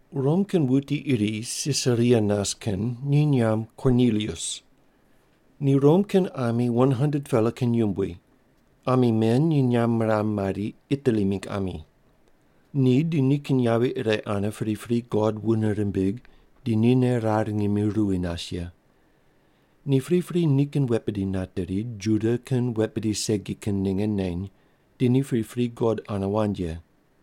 Rom kin wuti iri Sisaria nas kin ni nyamb Kornilius. Ni Rom kin ami 100-pela kin yumbui. Ami men ni nyamb miram mari, “Itali mingg ami.” Ni di nikin yavi ire ane pripri God wune rimbig di nine rar ngimi ruwi nas ye. Ni pripri nikin wet bidi nateri, Juda kin wet bidi segi kin ninge neny, di ni pripri God ane wand ye.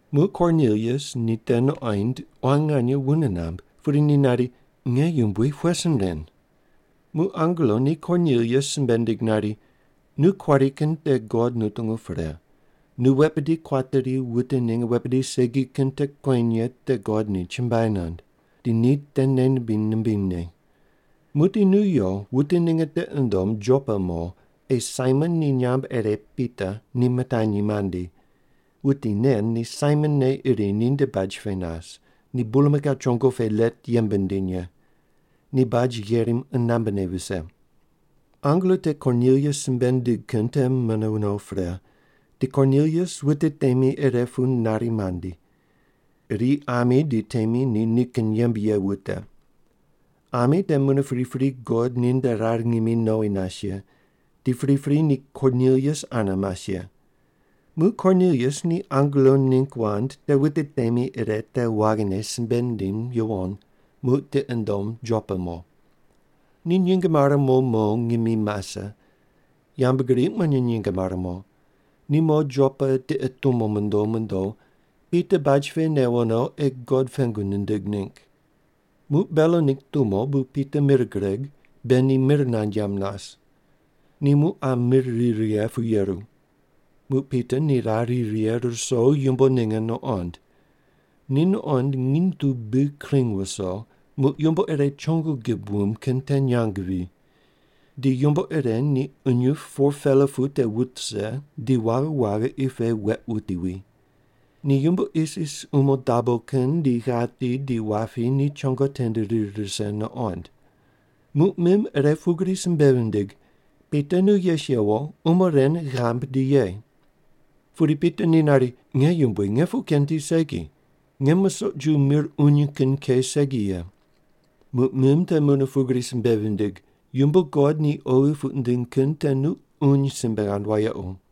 Muq Kornilius ni te nuqoind quan nganye wune namb, pudi ni nari, “Nge yumbui, pughe sin ren?” Muq angelo ni Kornilius simbe nindig nari, “Nu kuari kin te God nutungu pre, nu wet bidi kuateri wute ninge wet bidi segi kin te kueny ye te God ni chumbuai nand. Di ni te nei nimbiny nimbinyne. Muqdi nu yo, wute ninge tiqi ndom Jopa mo, ei Saimon ni nyamb ire Pita ni mitanyi mandi. Wuti nen ni Saimon ne iri ninde baj pe nas, ni bulmakau chongo pe let yembe nindim ye. Ni baj gherim qunambe ne vise.” Angelo te Kornilius simbe nindig kin te mune no pre, di Kornilius wute temi ire pu nari mandi. Iri ami di temi ni nikin yembe ye wute. Ami te mune pripri God ninde rar ngimi nowi nas ye, di pripri ni Kornilius ane mas ye. Muq Kornilius ni angelo ningg wand te wute temi ire te waghine simbe nindim yuwon, muq tiqi nundom Jopa mo. Ni nyinge mare mo mo ngimi mase. Yambgriq mune nyinge mare mo. Ni mo Jopa tiqe tumo mondo mondo, Pita baj pe newo no ei God pengu nindig ningg. Muq belo ningg tumo, bu Pita mir gureg, be ni mir nand yamb nas. Ni muq qa mir ri righe pu yeru. Muq Pita ni rar ri righe ruso yumbo ninge nuqond. Ni nuqond nginy tu bi kring viso, muq yumbo ire chongo gib wumb kin te nyang wi. Di yumbo ire ni qunyup 4-pela pu te wut rise di waghi waghi qi pe weq wuti wi. Ni yumbo isis umo dabo kin di ghati di wapi ni chongo tende rir rise nuqond. Muq mim ire pugri simbe vindig, “Pita, nu yes yewo, umo ren ghambui, di ye.” Pudi Pita ni nari, “Nge yumbui, nge puq ken tiq segi! Nge musoq ju mir uny kin ke segi ye.” Muq mim te mune pugri simbe vindig, “Yumbo God ni oghi puq nindiny kin te nu uny simbe ghand wayequ.”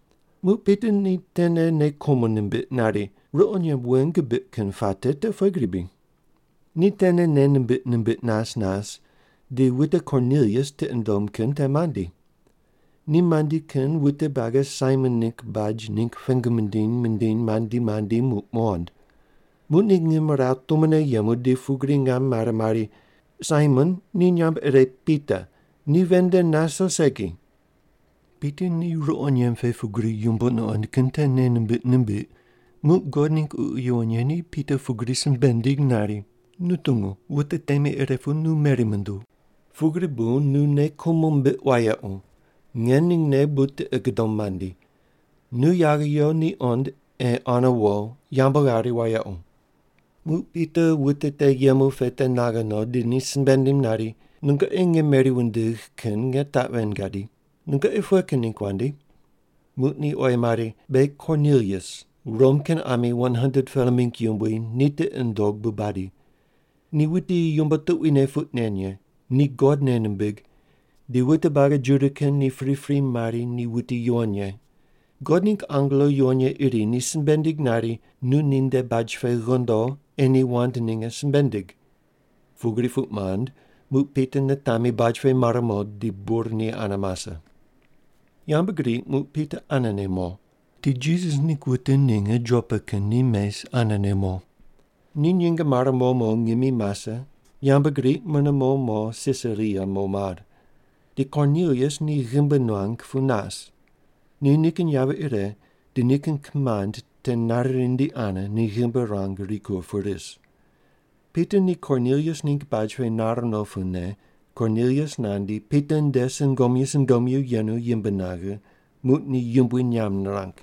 Muq Pita ni tene nei kumo nimbiq nari, “Ruqo nyemb wen gibiq kin puate te pughe gri bri?” Ni tene nei nimbiq nimbiq nas nas, di wute Kornilius tiqi nundom kin te mandi. Ni mandi kin wute buagi Saimon ningg baj ningg pengu mindiny mindiny mandi mandi muq muqond. Muq ni ngimrawu tumone yemu di pugri ngam mare mari, “Saimon, ni nyamb ire Pita, ni ven nde nas o segi?” Pita ni ruqo nyemb pe pugri yumbo nuqond kin te nei nimbiq nimbiq, muq God ningg Ququ Yuwon Ye ni Pita pugri simbe nindig nari, “Nu tungu, wute temi ire pu nu meri munduw. Pugri bu nu nei kumo mbiq wayequ. Nge ningne bu tiqi gudom mandi. Nu yaghe yo ni qond ei ane wo, yambu ghari wayequ.” Muq Pita wute te yemu pe te naghe no, di ni simbe nindim nari, “Nungoqi nge meri wundigh kin nge taq ven gadi. Nungoqi pughe kin ningg wandi?” Muq ni oyi mari, “Beghi Kornilius, Rom kin ami 100-pela mingg yumbui ni tiqi nundog bu badi. Ni wuti yumbo tuquine puq nen ye, ni God nei nimbig, di wute buagi Juda kin ni pripri mari ni wuti yuwon ye. God ningg angelo yuwon ye iri ni simbe nindig nari, nu ninde baj pe ghondo, ei ni wand ninge simbe ndig.” Pugri puq mand, muq Pita nitami baj pe mar mo, di bur ni ane mase. Yambgriq muq Pita anene mo. Di Jisas ningg wute ninge Jopa kin ni mes anene mo. Ni nyinge mare mo mo ngimi mase, yambgriq mune mo mo Sisaria mo mar. Di Kornilius ni ghimbi nuang pu nas. Ni nikin yavi ire di nikin kimand te nari rindi ane ni ghimbi ruang rikur pu ris. Pita ni Kornilius ningg baj pe nar no pune Kornilius nandi, Pita nde sungomyu sungomyu yenu yimb naghe, muq ni yumbui nyamb nirang.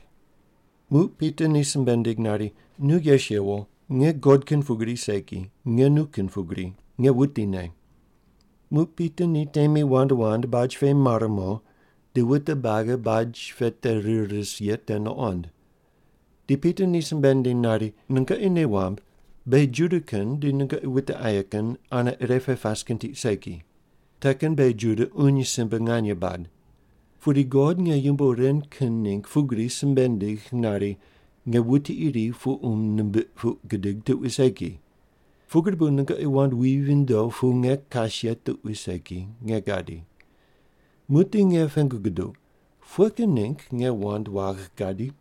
Muq Pita ni simbe nindig nari, “Nu yes yewo. Nge God kin pugri segi, nge nu kin pugri, nge wutine.” Muq Pita ni temi wand wand baj pe mar mo di wute buagi baj pe te rir ris ye te nuqond. Di Pita ni simbe nindiny nari, “Nungoqi nei wamb beghi Juda kin di nungoqi wute aye kin ane ire pe pas kin tiq segi. Te kin beghi Juda uny simbe nganye bad. Pudi God nge yumbo ren kin ningg pugri simbe nindigh nari, nge wuti iri puqum nimbiq puq gidig tuqui segi. Pugri bu nungoqi wand wi vindo pu nge kas ye tuqui segi, nge gadi. Muqdi nge pengu guduq, pughe kin ningg nge wand wagh gadi?”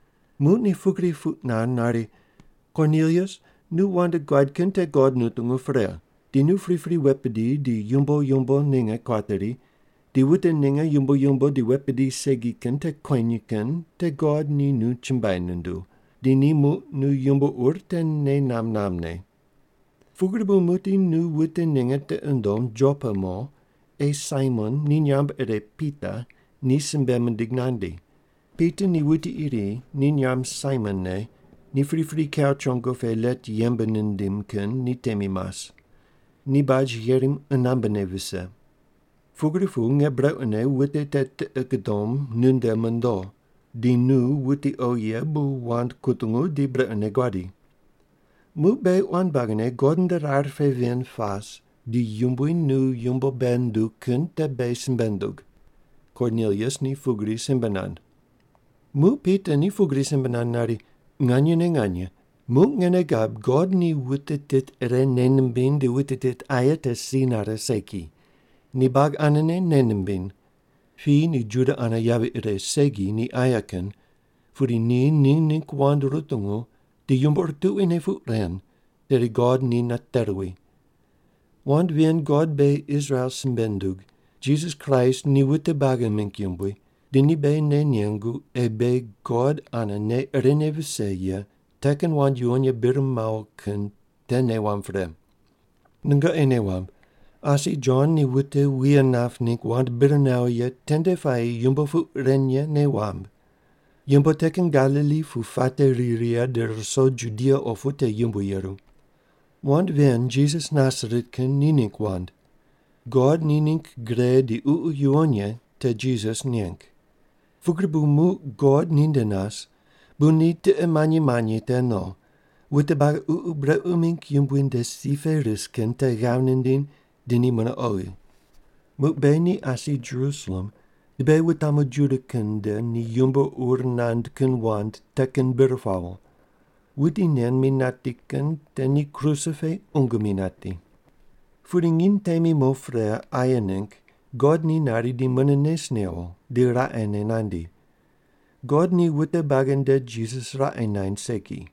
Muq ni pugri puq nand nari, ‘Kornilius, nu wand guad kin te God nutungu pre. Di nu pripri wet bidi di yumbo yumbo ninge kuateri di wute ninge yumbo yumbo di wet bidi segi kin te kueny kin te God ni nu chumbuai nunduw, di ni muq nu yumbo ur te nei namb nambne. Pugri bu muqdi nu wute ninge tiqi ndom Jopa mo, ei Saimon ni nyamb ire Pita ni simbe mindig nandi. Pita ni wuti iri ni nyamb Saimon ne ni pripri kau chongo pe let yembe nindim kin ni temi mas. Ni baj gherim qunambe ne vise.’ Pugri pu nge brequne wute te tiqi gudom nunde mondo, di nu wuti oghi ye bu wand kutungu di brequne guadi. Muq beghi quan buagine God nde rar pe ven pas, di Yumbui nu yumbo bei nunduw kin te beghi simbe ndug.” Kornilius ni pugri simbe nand. Muq Pita ni pugri simbe nand nari, “Nganyene nganye, muq nge nei gab God ni wute tit ire nei nimbiny di wute tit aye te si nare segi. Ni buagi anene nei nimbiny. Piyi ni Juda ane yavi ire segi ni aye kin, pudi ni ni ningg wand rutungu di yumbo ur tuquine puq ren, tedi God ni nate ruwi. Wand ven God beghi Israel simbe nundug, Jisas Kraist ni wute buagi mingg yumbui, di ni beghi nei nengu ei beghi God ane nei irene vise ye te kin wand yuwon ye bir mawo kin te nei wamb pre. Nungoqi nei wamb, asi Jon ni wute wuye nap ningg wand bir nawo ye tende puayi yumbo puq ren ye nei wamb. Yumbo te kin Galili pu puate ri righe di ruso Judia opu te yumbui yeru. Wand ven Jisas Nasaret kin ni ningg wand. God ni ningg gre di Ququ Yuwon Ye te Jisas neng. Pugri bu muq God ninde nas, bu ni tiqe manyi manyi te no, wute buagi ququ brequ mingg yumbui nde si pe ris kin te ghav nindiny di ni mune oghi. Muq beghi ni asi Jerusalem di beghi wutamu Juda kin nde ni yumbo ur nand kin wand te kin bir pawo. Wuti nen mi nati kin te ni kruse pe qungu mi nati. “Pudi nginy temi mo pre aye ningg God ni nari di mune nes newo di raqene nandi. God ni wute buagi nde Jisas raqe naind segi.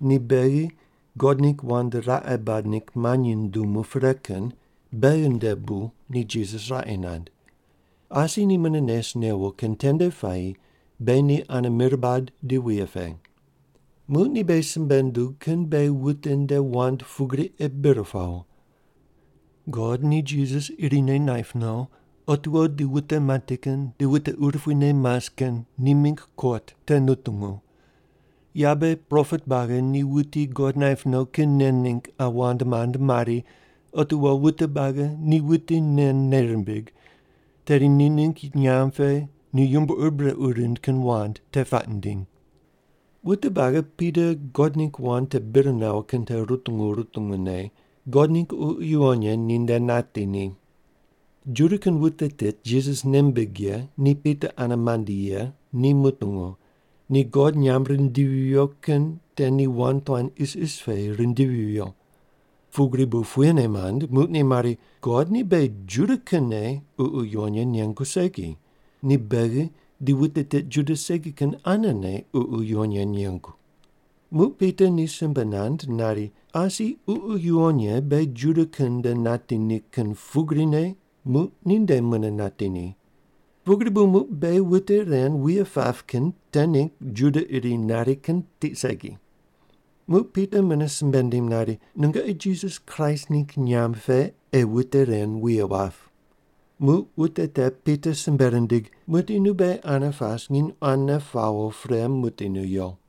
Ni beghi God ningg wand raqe bad ningg manyi nundumu pre kin beghi ndene bu ni Jisas raqe naind. Asi ni mune nes newo kin tende puayi beghi ni ane mir bad di wuye pe. Muq ni beghi simbe nundug kin beghi wute nde wand pugri ei bir pawo: God ni Jisas irine naip no, otiwo di wute mati kin di wute urupuine mas kin ni mingg kot te nutungu. Yabe propet buagi ni wuti God naip no kin nen ningg qa wand mand mari, otiwo wute buagi ni wuti nen nei rimbig, tedi ni ningg nyamb pe ni yumbo ur brequ rind kin wand te puaq nindiny.” Wute buagi Pita God ningg wand te bir nawo kin te rutungu rutungu ne, God ningg Ququ Yuwon Ye ninde nati ni. Juda kin wute tit Jisas nei mimbig ye ni Pita ane mandi ye ni mutungu, ni God nyamb rindivi viyo kin te ni wand tuan isis pe rindivi viyo. Pugri bu puyene mand, muq ni mari, “God ni beghi Juda kinne Ququ Yuwon Ye nengu segi. Ni beghi di wute tit Juda segi kin anene Ququ Yuwon Ye nengu.” Muq Pita ni simbe nand nari, “Asi Ququ Yuwon Ye beghi Juda kin nde nati ni kin pugrine muq ninde mune nati ni. Pugri bu muq beghi wute ren wuye pap kin te ningg Juda iri nari kin tiq segi.” Muq Pita mune simbe nindim nari, “Nungoqi Jisas Kraist ningg nyamb pe ei wute ren wuye wap.” Muq wute te Pita simbe rindig, “Muqdi nu beghi ane pas nginy quane pawo pre muqdi nu yo.”